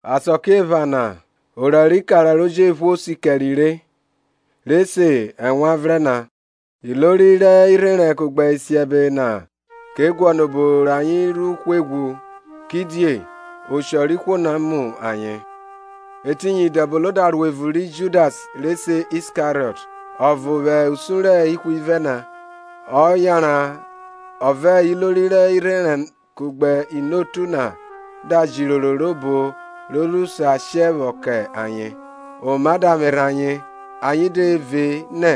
Asakiephana orẹ rẹ ikara ro jephuo si kẹre re, re se Ewanvrẹn na. Ilori rẹ irherẹn kugbe isiẹbe na ke guọnọ obo rẹ ayen ru hwe ghwu; kidie oshọ rẹ ihwo na mu ayen. Etiyin Idẹbono da ro evun ri Judas re se Iskariọt, ọvo vwẹ usun rẹ ihwivẹ na; ọ yanran ọ vẹ ilori rẹ irherẹn kugbe inotu na da ra jẹ iroro obo ro ru sa she vwọ kẹ ayen. Oma da vwerhe ayen, ayen de ve nẹ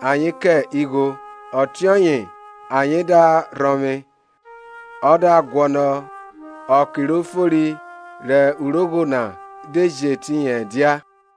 ayen kẹ igho. Ọtiọye ayen da rhọvwe, ọ da guọnọ ọke ro fori rẹ urogho na de jẹ etiyin ẹdia.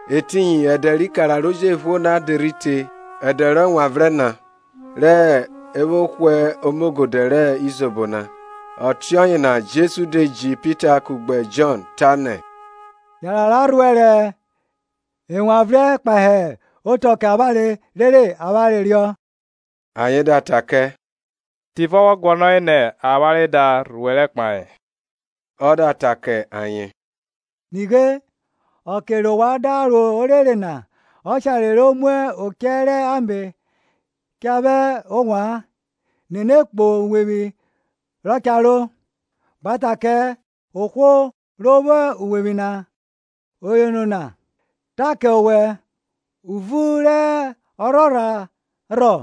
Etiyin ẹdẹ rẹ ikara ro jephuo na de rhi te, ẹdẹ rẹ ẹwanvrẹn na re vwo hwe omogodẹ rẹ izobo na. Ọtiọye na Jesu de ji Pita kugbe Jọn, tanẹ, Yanran ra rhuẹrẹ ẹwanvrẹn kpahe otọ kẹ avwanre, rere avwanre riọ. Ayen da ta kẹ, Tivọ wọ guọnọre nẹ avwanre da rhuẹrẹ kpahe? Ọ da ta kẹ ayen, Nighe, ọke rẹ ovwan da ro orere na, ọshare ro mu ochẹ rẹ ame cha vwa ovwan; nene kpo uwevwi rọ cha ro, gba ta kẹ ohwo ro vwo uwevwi na, Oyono na ta kẹ owẹ, Uvun rẹ ọrhorha rhọ,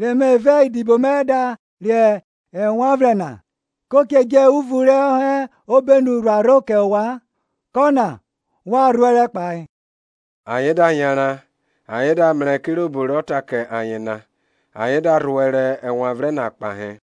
re me vẹ idibo mẹ da re ẹwanvrẹn na? Ko che dje uvun rọ hẹ obenu rhuarho kẹ ovwan; kọna wa rhuẹrẹ kpahe. Ayen da yanran, ayen da mrẹ kirobo rọ ta kẹ ayen na; ayen da rhuẹrẹ ẹwanvrẹn na kpahe.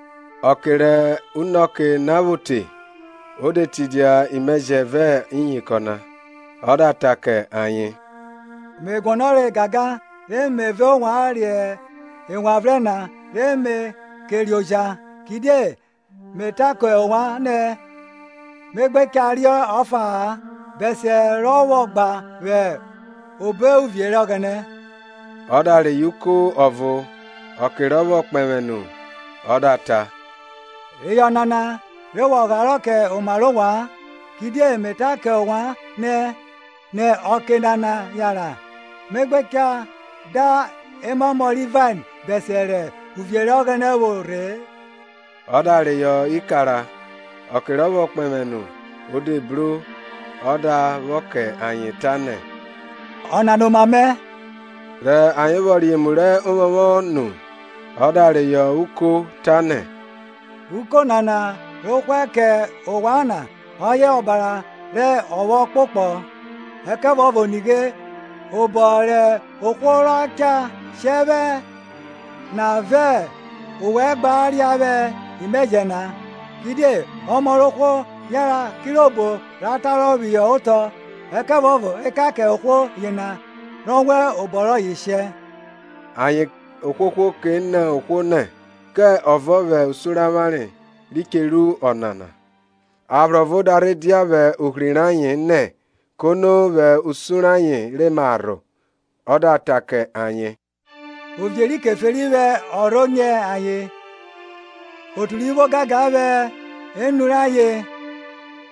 Ọke rẹ unọke na vwo te, o de tidia imẹjẹ, ọ vẹ iyinkọn na. Ọ da ta kẹ ayen, Me guọnọre gangan re me vẹ ovwan re ẹwanvrẹn na re me ke re oja; Kidie me ta kẹ ovwan nẹ me gbe cha riọ ọfa-a bẹsiẹ rọ vwọ gba vwẹ obo uvie rẹ Ọghẹnẹ. Ọ da reyọ uko ọvo, ọke rọ vwọ kpẹvwẹ nu ọ da ta, Reyọ ọnana, re wa gharọ kẹ oma rẹ ovwan; kidie me ta kẹ ovwan nẹ nẹ ọke nana yanran me gbe cha da emamọ ri vain bẹsiẹ rẹ uvie rẹ Ọghẹnẹ vwọ rhe-e. Ọ da reyọ ikara, ọke rọ vwọ kpẹvwẹ nu o de bro ọ da vwọ kẹ ayen, tanẹ, Ọnana oma mẹ. Rẹ ayen vwọ re emu rẹ ovwọnvwọn nu, ọ da reyọ uko tanẹ, Uko nana ro hwẹ kẹ ovwan na ọye ọbara rẹ ọphọ ọkpokpọ. Ẹkẹvuọvo nighe obọ rẹ ohwo rọ cha shẹ vwẹ na vẹ ovwẹ gba ria vwẹ imẹjẹ na. Kidie Ọmọ rẹ ohwo yanran kirobo ra tarọ phihọ otọ; ẹkẹvuọvo ekan kẹ ohwo yena ra wan obọ rọye shẹ! Ayen ohwohwo ke nọ ohwo nẹ, kẹ ọvo vwẹ usun rẹ avwanre ri che ru ọnana. Aphro ọvo da rhe dia vwẹ ohri rẹ ayen nẹ, kono vwẹ usun rẹ ayen re ma rho. Ọ da ta kẹ ayen, Ovie ri Keferi vwẹ ọrho nyẹ ayen; otu ri vwo ogangan vwẹ enu rẹ ayen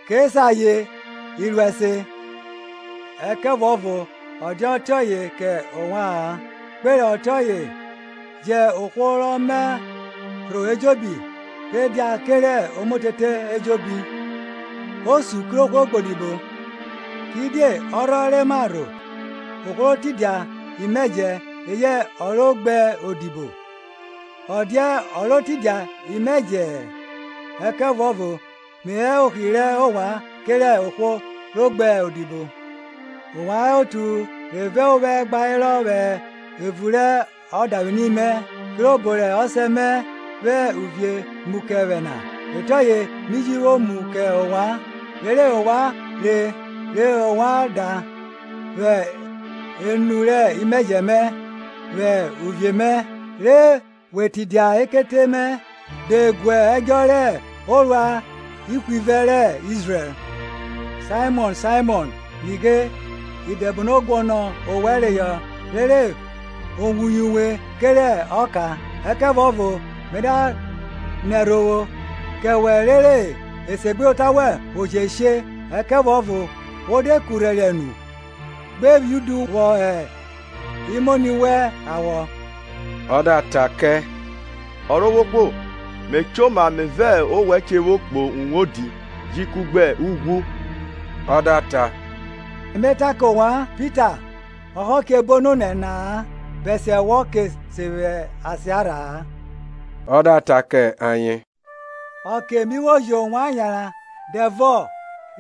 ke se ayen iruẹse. Ẹkẹvuọvo ọ dia ọtiọye kẹ ovwa-an; kpe rẹ ọtiọye jẹn ohwo rọ ma rho ejobi rhe dia kerẹ omotete ejobi, osun kerẹ ohwo ro gbe odibo. Kidie ọrhọ re ma rho, ohwo ro tidia imẹjẹ, eyẹ ọ ro gbe odibo? Ọ dia ọ ro tidia imẹjẹ-ẹ? Ẹkẹvuọvo me hẹ ohri rẹ ovwan kerẹ ohwo ro odibo. Ovwan hẹ otu re vẹ ovwẹ gba herọ vwẹ evun rẹ odavwini mẹ; kirobo rẹ Ọsẹ mẹ vwẹ uvie mu kẹ vwẹ na, ọtiọye mi ji vwo mu kẹ ovwan. rere ovwan re re ovwan ria vwẹ enu rẹ imẹjẹ mẹ vwẹ uvie mẹ, re we tidia ekete mẹ de guẹdjọ rẹ orua ihwivẹ rẹ Izrẹl. Saimọn, Saimọn, nighe, Idẹbono guọnọ owẹ reyọ, rere o wuye uwe kerẹ ọka, ẹkẹvuọvo me da nẹ ẹrhovwo kẹwẹ rere esegbuyota wẹn vwo je she; ẹkẹvuọvo wo de kurhẹriẹ nu, gbe phi udu vwọ hẹ imoni wẹn awọ. Ọ da ta kẹ, Ọrovwohwo, me choma me vẹ owẹ che vwo kpo uwodi ji kugbe ughwu. Ọ da ta, me ta kẹ owẹ, Pita, ọhọ che bo nonẹ na-a, bẹsiẹ wọ ke sen vwẹ asiarha-a. Ọ da ta kẹ ayen, Ọke mi vwo ji ovwan yanran dẹvọ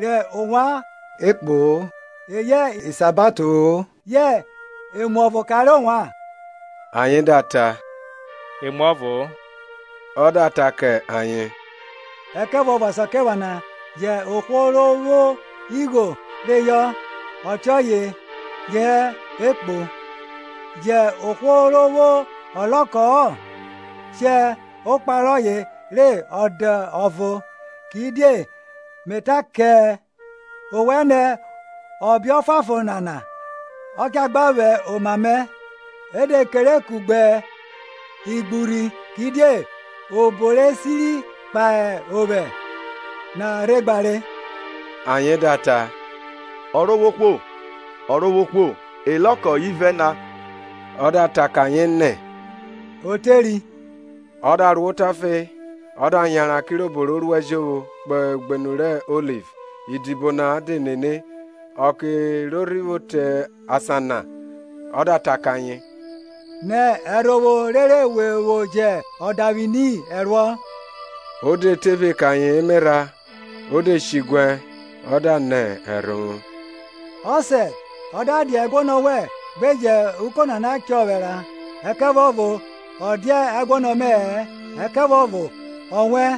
rẹ ovwan ghwa ekpo-o eyẹ isabato-o ye emuọvo kanre ovwan? Ayen da ta, Emuọvo-o. Ọ da ta kẹ ayen, Ẹkẹvuọvo Asakiephana, jẹn ohwo ro vwo igho reyọ, ọtiọye je hẹ ekpo. Jẹn ohwo ro vwo ọlọkọ-ọ shẹ okpa rọye re ọ dẹ ọvo. Kidie me ta kẹ, owẹ nẹ ọbe ọfuanfon nana cha gba vwẹ oma mẹ, E de kere kugbe igburhi; kidie obo re siri kpahe ovwẹ na rhe gbare. Ayen da ta, Ọrovwohwo, Ọrovwohwo, ọlọkọ ivẹ na. Ọ da ta kẹ ayen nẹ, O teri. Ọ da ro otafe, ọ da yanran, kirobo ro ruẹ jovwo, kpo ugbenu rẹ Oliv; idibo na de nene. Ọke ro rhi vwo te asan na ọ da ta kẹ ayen, Nẹ ẹrhovwo rere we vwo jẹ odavwini ẹruọ. O de tephe kẹ ayen emerha, o de shiguẹ ọ da nẹ ẹrhovwo, Ọsẹ, ọ da dia ẹguọnọ wẹ, gbe jẹ uko nana chọ vwẹ ra; ẹkẹvuọvo ọ dia ẹguọnọ mẹ-ẹ, ẹkẹvuọvo ọwẹn,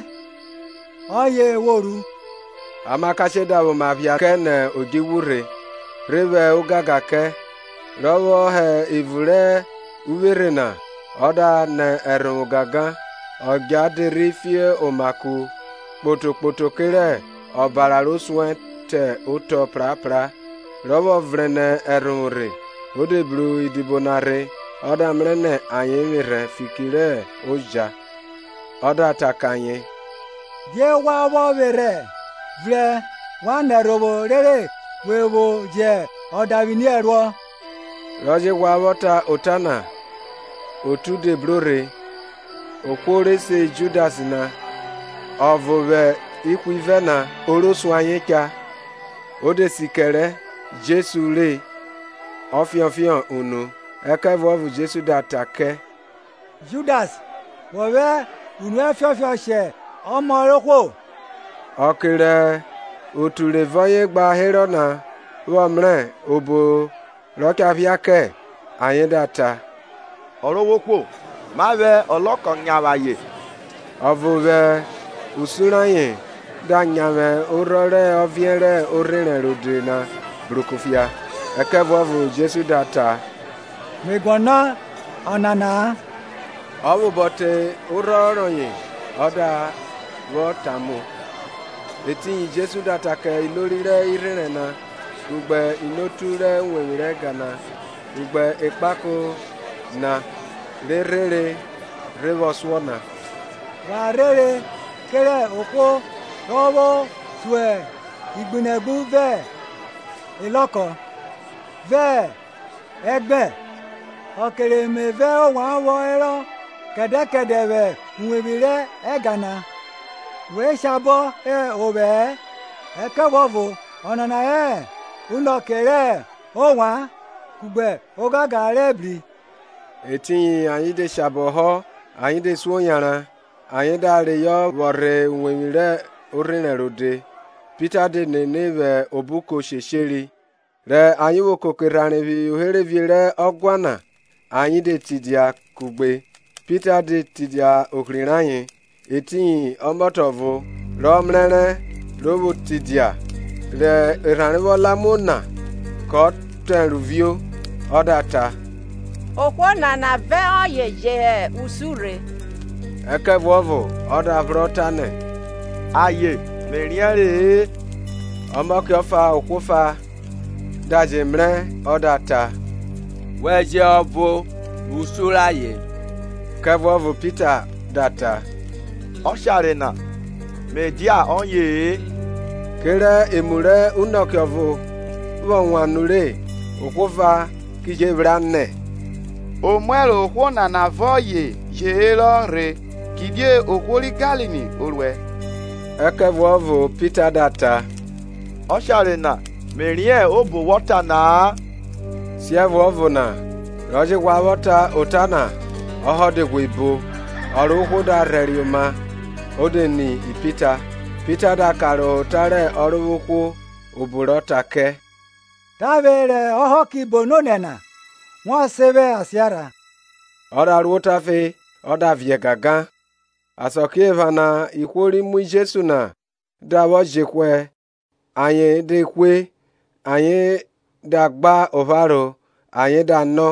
ọye wo ru. Amakashe da vwẹ oma phia kẹ nẹ odjuvwu rhe, rhe vwẹ ogangan kẹ. Rọ vwọ hẹ evun rẹ uvwerhe na ọ da nẹ ẹrhovwo gangan; ọdja de rhi fio oma ku kporo kporo kerẹ ọbara ro suẹn te otọ prapra. Ro vwo vrẹn nẹ ẹrhovwo rhe, o de bru idibo na rhe ọ da mrẹ ayen re vwerhẹ fiki rẹ oja, ọ da ta kẹ ayen, Die wa vwọ vwerhẹ? Vrẹn wa nẹ ẹrhovwo rere we vwo jẹ odavwini ẹruọ. Rọ je ghwa vwọ ta ota na, otu de bro rhe, ohwo re se Judas na, ọvo vwẹ ihwivẹ na, o ro suẹn ayen cha. O de si kerẹ Jesu re ọ ọfiọnfiọn unu; Ẹkẹvuọvo Jesu da ta kẹ, Judas, wọ vwẹ unu ẹ fiọnfiọn shẹ Ọmọ rẹ ohwo? Ọke rẹ otu re vẹ ọye gba herọ na vwọ mrẹ obo re cha phia kẹ, ayen da ta, Ọrovwohwo, ma vwẹ ọlọkọ nyavwe ayen? Ọvo vwẹ usun rẹ ayen da nyavwe orhọn rẹ ọviẹn rẹ orherẹn rode na bru kufia. Ẹkẹvuọvo Jesu da ta, me guọnọ ọnana-a! Ọ vwẹ obọ te orhọn rọye ọ da vwọ tamu. Etiyin Jesu da ta kẹ ilori rẹ irherẹn na kugbe inotu rẹ uwevwi rẹ ẹga na kugbe ekpako na, re rhere rhe vwọ suọ na, Wa rhere kerẹ ohwo rọ vwọ so igbunegbu vẹ elọko, vẹ egbẹn? Ọke re me vẹ ovwan vwọ herọ kẹdẹ kẹdẹ vwẹ uwevwi rẹ ẹga na, we shabọ họ ovwẹ-ẹ. Ẹkẹvuọvo ọnana hẹ unọke rẹ ovwan, kugbe ogangan rẹ ebri. Etiyin ayen de shabọ họ ayen de suo yanran, ayen da reyọ vwọ rhe uwevwi rẹ orherẹn rode. Pita de nene vwẹ obuko shesheri; rẹ ayen vwo koko erhanre phihọ uherevie rẹ ọguan na ayen de tidia kugbe, Pita de tidia ohri rẹ ayen. Etiyin ọmọtẹ ọvo, rọ mrẹrẹ ro vwo tidia rẹ erhanre vwo la muo na kọ tọn ẹro vio, ọ da ta, Ohwo nana vẹ ọye je hẹ usun rhe. Ẹkẹvuọvo ọ da phrọ, tanẹ, Aye, me riẹnrẹ-ẹ. Ọmọke ọfa ohwo ọfa da je mrẹ ọ da ta, Wẹ je hẹ ọvo vwẹ usun rẹ ayen. Ẹkẹvuọvo Pita da ta, Ọshare na, me dia ọye-e. Kerẹ emu rẹ unọke ọvo vwọ wan nure ohwo ọfa ki je vwra, nẹ, Omuẹro ohwo nana vẹ ọye je herọ rhe; kidie ohwo ri Galili o ruẹ Ẹkẹvuọvo Pita da ta, Ọshare na, mẹ riẹn obo wọ ta na-a. Siẹvuọvo na, ro je ghwa vwọ ta ota na, ọhọ de ghwe bo. Ọrovwohwo da rhẹriẹ oma o de ni Pita. Pita da karohọ ota rẹ Ọrovwohwo, obo rọ ta kẹ, Tavwe rẹ ọhọ ki bo nonẹ na, wọ sen vwẹ asiarha. Ọ da ro otafe ọ da viẹ gangan. Asakiephana ihwo ri mu Jesu na da vwọ jehwẹ ayen de hwe; ayen da gba opharo ayen da nọ,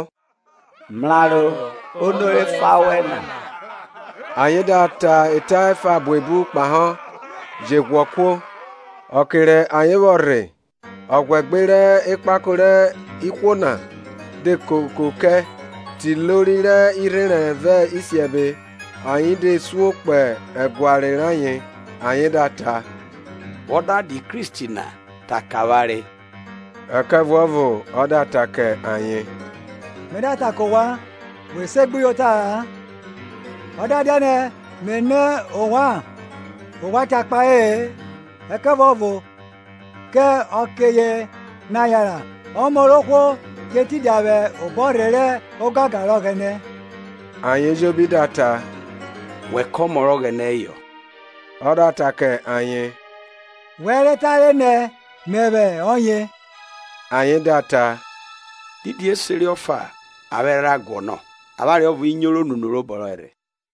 Mraro, ono re fa wẹ na? Ayen da ta eta efa buebu kpahọ, je ghwọ kuo. Okẹ rẹ ayen vwọ rhe, ọghwẹgbe rẹ ekpako rẹ ihwo na de koko kẹ, te ilori rẹ irherẹn vẹ isiẹbe; ayen de suo kpo ẹguare rayen, ayen da ta, Wọ da dia Kristi na, ta kẹ avwanre. Ẹkẹvuọvo ọ da ta kẹ ayen, Me da ta kẹ ovwan, we segbuyota-a; ọ da dianẹ me nọ ovwan, ovwan cha kpahe-e. Ẹkẹvuọvo kẹ ọke na yanran Ọmọ rẹ ohwo che tidia vwẹ obọrhe rẹ ogangan rẹ Ọghẹnẹ. Ayen ejobi da ta, Wẹ kẹ Ọmọ rẹ Ọghẹnẹ heyọ? Ọ da ta kẹ ayen, Wẹ re tare nẹ Mẹvwẹ ọye. Ayen da ta, Didi iseri ọfa avwanre rha guọnọ? Avwanre ọvo ri nyoro nẹ unu robọ rọye rhe.